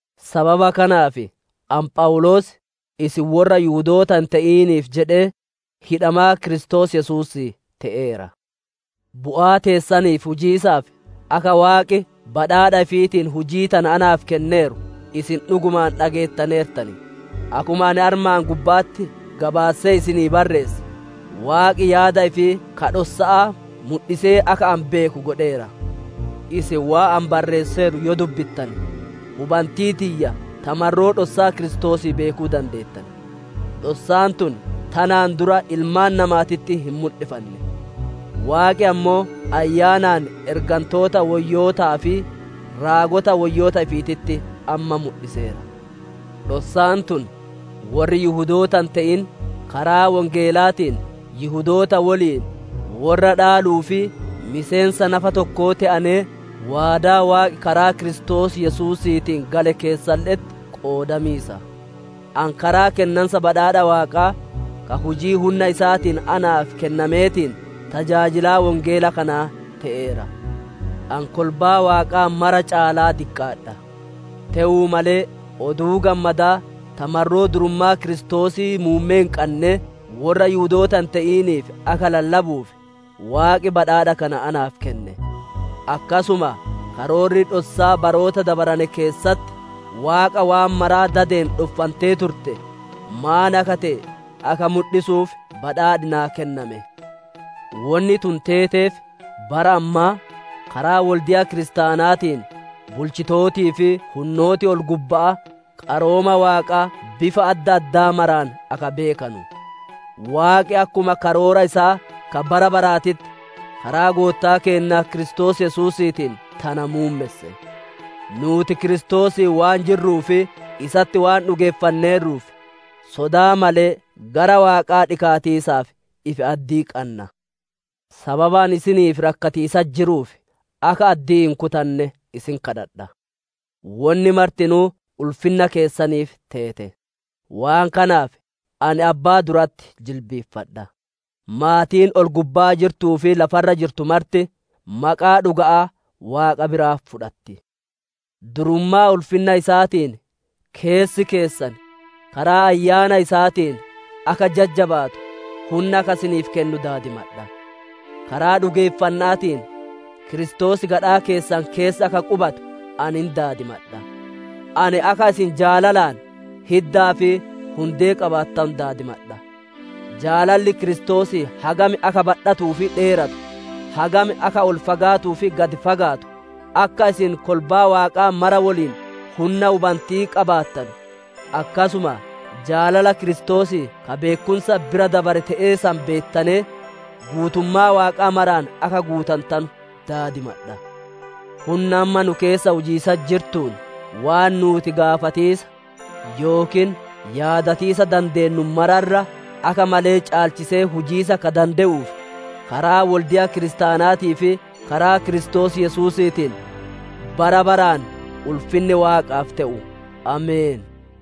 Sababa kanaaf, ani Phawuloos, isin worra Yihudoota hin te'iniif jedhee hidhamaa Kiristoos Yesuusii te'eera. Bu'aa teessaniif hujiisaaf akka Waaqi badhaadha ifiitiin hujii tana naaf kenneeru isin dhugumaan dhageettaneertan. Akkuma ani armaan gubba'atti gabaassee isinii barreesse, Waaqi yaada ifii ka dhossa'aa mudhisee akka ani beeku godheera. Isin waan ani barreesseeru yoo dubbittane, hubantii tiyya ta marroo dhossaa Kiristoosii beekuu dandeettan. Dhossaan tun tanaan dura ilmaan namaatitti hin mudhifanne, Waaqi ammoo Ayyaanaan ergantoota woyyootaa fi raagota woyyoota ifiititti amma mudhiseera. Dhossaan tun, worri Yihudoota hin te'in karaa Wongeelaatiin Yihudoota woliin worra dhaaluu fi miseensa nafa tokkoo te'anee, waadaa Waaqi karaa Kiristoos Yesuusiitiin gale keessalle'etti qoodamiisa. Ani karaa kennansa badhaadha Waaqaa, ka hujii hunna isaatiin naaf kennameetiin tajaajilaa Wongeela kanaa te'eera. Ani kolbaa Waaqaa mara caalaa diqqaadha; te'uu malee, Oduu Gammadaa ta marroo durummaa Kiristoosii muummee hin qannee worra Yihudoota hin te'iniif akka lallabuuf Waaqi badhaadha kana naaf kenne. Akkasuma karoorri dhossaa baroota dabarane keessatti Waaqa waan mara dadeen dhoffantee turtee, maan akka te'e, akka mudhisuuf badhaadhi naa kenname. Wonni tun teeteef, bara ammaa, karaa wolde'a kiristaanaatiin, bulchitootii fi hunnooti ol-gubba'aa qarooma Waaqaa bifa adda addaa maraan akka beekanu. Waaqi akkuma karoora isaa ka bara baraatitti, karaa Goottaa keenna Kiristoos Yesuusiitiin tana muummesse. Nuuti Kiristoosiin waan jirruu fi isatti waan dhugeeffanneerruuf, sodaa malee gara Waaqaa dhikaatiisaaf ifi addii qanna. Sababa ani isiniif rakkatiisatti jiruuf, akka addii hin kutanne isin kadhadha; wonni martinuu ulfinna keessaniif teete. Waan kanaaf ani Abbaa duratti jilbiiffadha. Maatiin ol-gubbaa jirtuu fi lafa irra jirtu marti maqaa dhuga'aa Waaqa biraa fudhatti. Durummaa ulfinna isaatiin keessi keessan karaa Ayyaana isaatiin akka jajjabaatu hunna akka isiniif kennu daadimadha. Karaa dhugeeffanna'aatiin Kiristoos gadhaa keessan keessa akka qubatu ani hin daadimadha. Ani akka isin jaalalaan hiddaa fi hundee qabaattanu daadimadha. Jaalalli Kiristoosii hagam akka badhatuu fi dheeratu, hagam akka ol fagaatuu fi gad fagaatu, akka isin kolbaa Waaqaa mara woliin hunna hubanti'ii qabaattanu, akkasuma jaalala Kiristoosii ka beekkumsa bira dabare te'e san beettanee, guutummaa Waaqaa maraan akka guutantanu daadimadha. Hunna amma nu keessa hujiisatti jirtuun waan nuuti gaafatiisa, yookiin yaadatiisa dandeennu mara irra akka malee caalchisee hujiisa ka dande'uuf, Karaa wolde'a kiristaanaatii fi karaa Kiristoos Yesuusiitiin bara baraan ulfinni Waaqaaf te'u! Ameen.